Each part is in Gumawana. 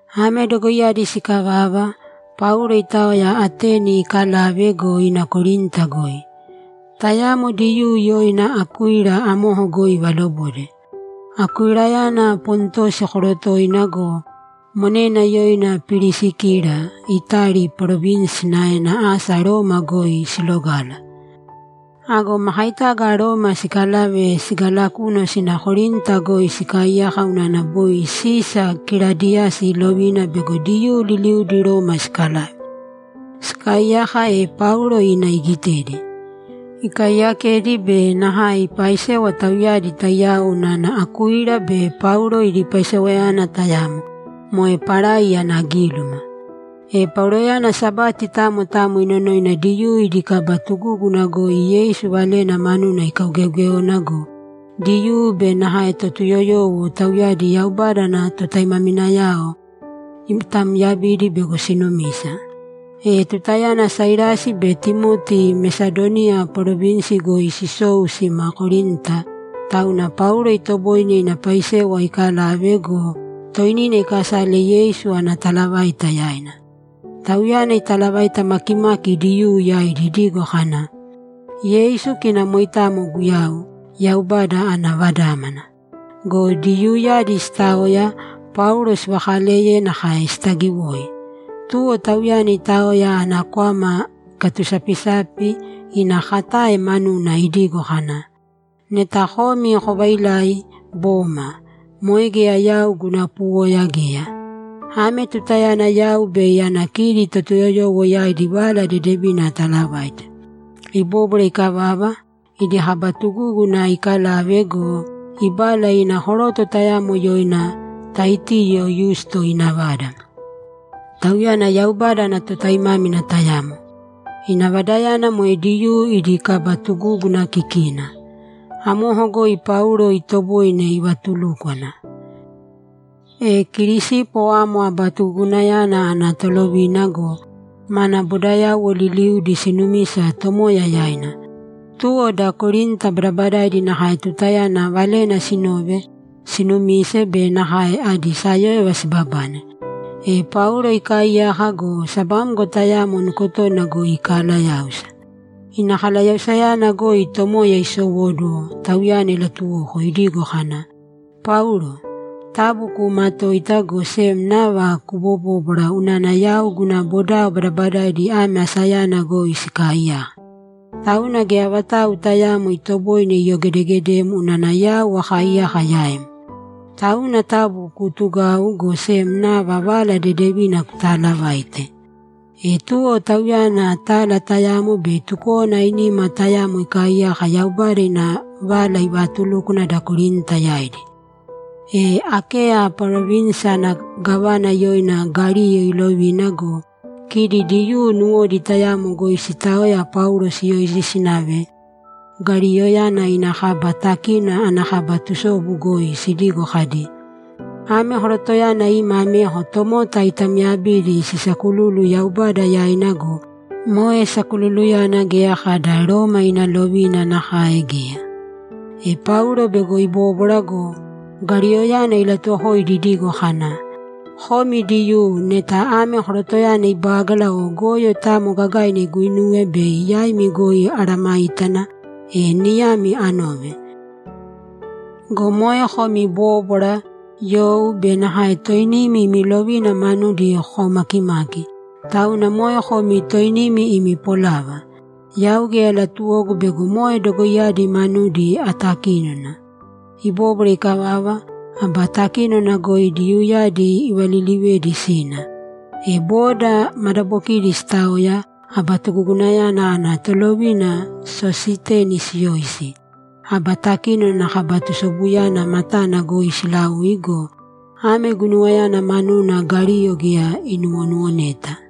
Ame dogoiyadi sikavava, Paulo itaoya Ateni ikalave go, ina Korinta goi. Tayamo Diyuu yoina Akuila amoko goi ivalobode. Akuilayana Pontosi korotoina go, monena yoina Pirisikila Itali parovinsi sinaena asa Roma goi silogala. Ago makaitaga Roma sikalave sigalakunu sima Korinta goi sikaaiyaka unana boi Sisa Kiladiyasi ilovina bego Diyuu liliudi Roma sikalave. Sikaaiyaka, e Paulo ina igitedi. Ikaaiyakedi be nakae ipaaisewa tauyadi taiyao unana Akuila be Paulo idi paisewayana tayamo, moe parai ana gíluma. E Pauloyana Sabati tamo tamo inonoina Diyuu idi kaba tugúguna goi Yeisu Valena manuna ikaugeeogéona go, Diyuu be nakae Totuyoyowo, tauyadi Yaubada ana totaimaminayao, itaamyabidi bego sinumisa. E tutayana Sailasi be Timoti Mesadoniya parovinsi goi sisou sima Korinta, tauna Paulo itoboine ina paisewa ikalave go, toinina ikasale Yeisu ana talavaita yaina. Tauyana italavaita makimaki Diyuu yaidi idigo kana, ‘Yeisu kina moitamo Guyau, Yaubada ana Vadámana.’ Go Diyuuyadi sitaoya, Paulo sivaakaleye nakae sitaagiwoi. Tuwo tauyana itaoya ana kwama ikatusapisapi ina katae manuna idigo kana, ‘Neta komi kovailai, boma! Moe geya yau guna puwoya geya. Ame tutayana yau bei ana kidi Totuyoyowo yaidi Vala Dedevina atalavaite.’ Ibóbwara ikavava, idi kaba tugúguna ikalave go, ibala ina koroto tayamo yoina Taitiyo Yusto ina vada. Tauyana Yaubada ana totaimámina tayamo. Ina vadayana moe Diyuu idi kaba tugúguna kikina. Amoko goi Paulo itoboine ivatulúkwana. E Kirisipo amo aba tugugunayana ana tolovina go, mana bodayauwo liliudi sinumisa Tomoya yaina. Tuwo da Korinta badabadaidi nakae tutayana valena sinove, sinumise be nakae adi sayóyova sibabane. E Paulo ikaaiyaka go, sabamgo tayamo nukotona goi ikalayáusa. Ina kalayausayana goi Tomoya isowóduwo, tauyana ilatuwoko idigo kana, ‘Paulo, taabu kuumatōita, go sem nava kubobōbwara unana yau guna bodao badabadaidi ame asayana goi sikaaiyaka. Tauna geya vatau tayaamo itoboine iyogedegedem unana yau akaaiyaka yaim. Tauna taabu kuutugāu, go sem nava Vala Dedevina kutaalavāite.’ E tuwo tauyana tala tayamo be tukówana ainima tayamo ikaaiyaka Yaubada ina Vala ivaatulúkwana da Korinta yaidi. E Akeya parovinsi ana gávana yoina Galiyo iilovina go, kidi Diyuu nuwodi tayamo goi sitaoya Paulo siyoisi sinave Galiyoyana ina kaba takínona ana kaba tusobu goi sidigo kadi, ‘Ame korotoyana ima ameko tomota itamyabidi sisaakululu Yaubada yaina go, moe sakululuyana geya kada Roma ina lovina nakae geya.’ E Paulo bego ibóbwara go, Galiyoyana ilatuwokoidi idigo kana, ‘Komi Diyuu, neta ame korotoyana ibágala o goyo tamo gagaina iguinuwe, bei yaimi goi amesayágana, e niyami anove. Go moe komi bóbwara, you be nakae toinimi imi lovina manudi kokaumakimaki, tauna moe komi toinimi imi polava. Yau geya latuwogu bego moe dogoiyadi manudi atakínona.’ Ibóbwara ikavava, aba takínona goi Diyuuyadi ivalilivedi sina. E boda madabokina sitaoya, aba tugugunayana ana tolovina Sositeni siyoisi, aba takínona ana kaba tusobuyana matana goi silaui go, ame guinuwayana manuna Galiyo geya inuwonuwoneta.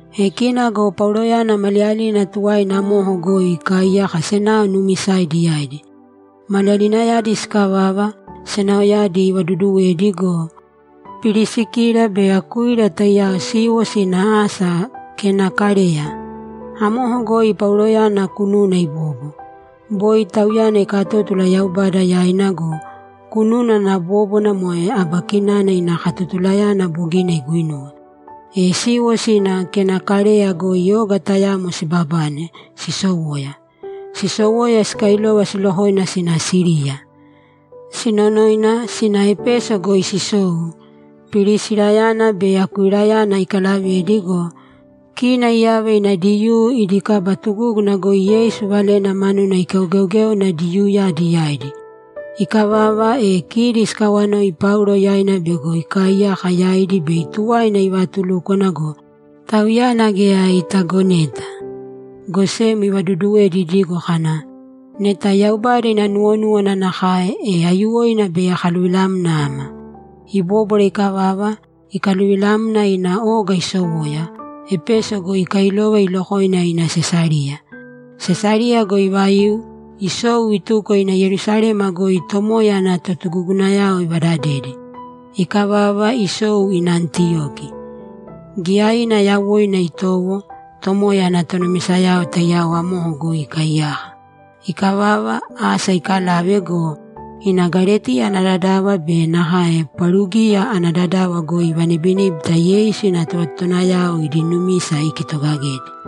E kina go Pauloyana maliyalina tuwaina amoko goi ikaaiyaka senao nuumisaidi yaidi. Maliyalinayadi sikavava, senaoyadi ivaduduwedi go, Pirisikila be Akuila taiyao siiwo sina asa Kenakareya. Amoko goi Pauloyana kununa ibobo. Boi tauyana ikatótula Yaubada yaina go, kununa ana bóbwana moe aba kinana ina katotulayana bogina iguinuwe. E siiwo sina Kenakareya goi oga tayamo sibabane, sisowoya. Sisowoya, sikailova silokoina sina Siriya. Sinonoina, sina Epeso goi sisou, Pirisirayana be Akuilayana ikalavedi go, kina iyava ina Diyuu idi kaba tugúguna goi Yeisu Valena manuna ikaugeogéona Diyuuyadi yaidi. Ikavava, e kidi sikawanoi Paulo yaina bego ikaaiyaka yaidi bei tuwaina ivaatulúkwana go, tauyana geya itagoneta, go sem ivaduduwedi idigo kana, ‘Neta Yaubada ina nuwonúwana nakae, e aiyuwoina bei akaluvilamna ama.’ Ibóbwara ikavava, ikaluvilamna ina oga isowoya, Epeso goi ikailova ilokoina ina Sesariya. Sesariya goi ivaiu, isou, ituko ina Yerusalema goi Tomoya ana totugugunayao ivadadedi. Ikavava, isou ina Antiyoki. Giyaina yawoina itowo Tomoya ana tonumisayao taiyao amoko goi ikaaiyaka. Ikavava, asa ikalave go, ina Galetiya ana dadava be nakae Parugiya ana dadava goi ivanibiníbita Yeisu ina tovatotowanayao idi numisa ikitogagedi.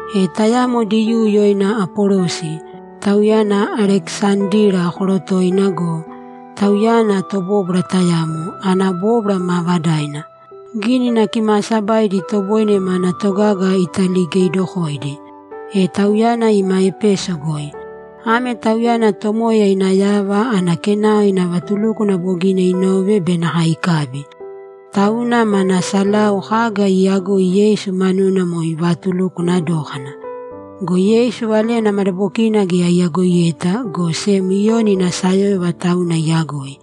E tayamo Diyuu yoina Apolosi, tauyana Alekisandira korotoina go, tauyana tobóbwara tayamo, ana bóbwara maavadaina. Gínina Kimaasabaidi itoboine mana togaga italigeidokoidi. E tauyana ima Epeso goi. Ame tauyana Tomoya ina yava ana kenao ina vatulúkwana bogina inove be nakae ikabi. Tauna mana salau kaga iiyagoi Yeisu manuna moe ivatulukwana dókana. Go Yeisu valena madabokina geya iyagoiyeta, go sem Iyoni ina sayóyova tauna iyagoi.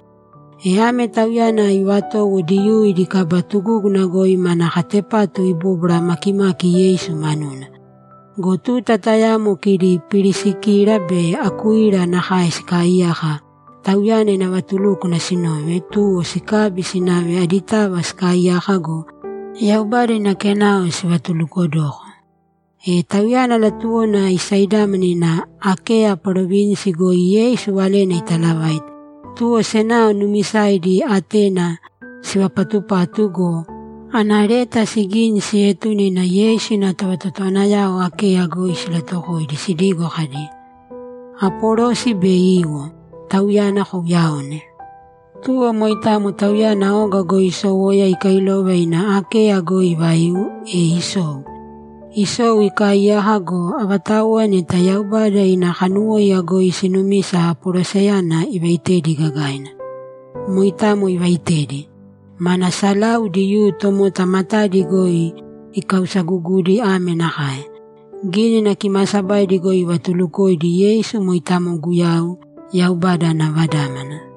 E ame tauyana ivatowo Diyuu idi kaba tugúguna goi mana katepatu ibobwara makimaki Yeisu manuna. Go tuta tayamo kidi Pirisikila be Akuila nakae sikaaiyaka, tauyana ina vatulúkwana sinove, tuwo sikabi sinave aditava sikaiyaka go, Yaubada ina kenao sivatulukodoko. E tauyana latuwona isaidámana ina Akeya parovinsi goi Yeisu Valena italavaite, tuwo senao nuumisaidi atena sivapatupatu go, ana leta sigini sietune ina Yeisu ina tovatotowanayao Akeya goi silatuwokoidi sidigo kadi, ‘Apolosi bei iwo; tauyana kouyaōne.’ Tuwo moitamo tauyana oga isowoya ikailova ina Akeya goi ivaiu, e isou. Isou, ikaaiyaka go, avatauwa neta Yaubada ina kanuwóiya goi siinumisa Apolosiyana ivaitedi gagaina. Moitamo ivaitedi. Mana salau Diyuu tomota matadi goi ikausagugudi ame nakae: Gínina Kimaasabaidi goi ivatulukoidi Yeisu moitamo Guyau, Yaubada ana Vadámana.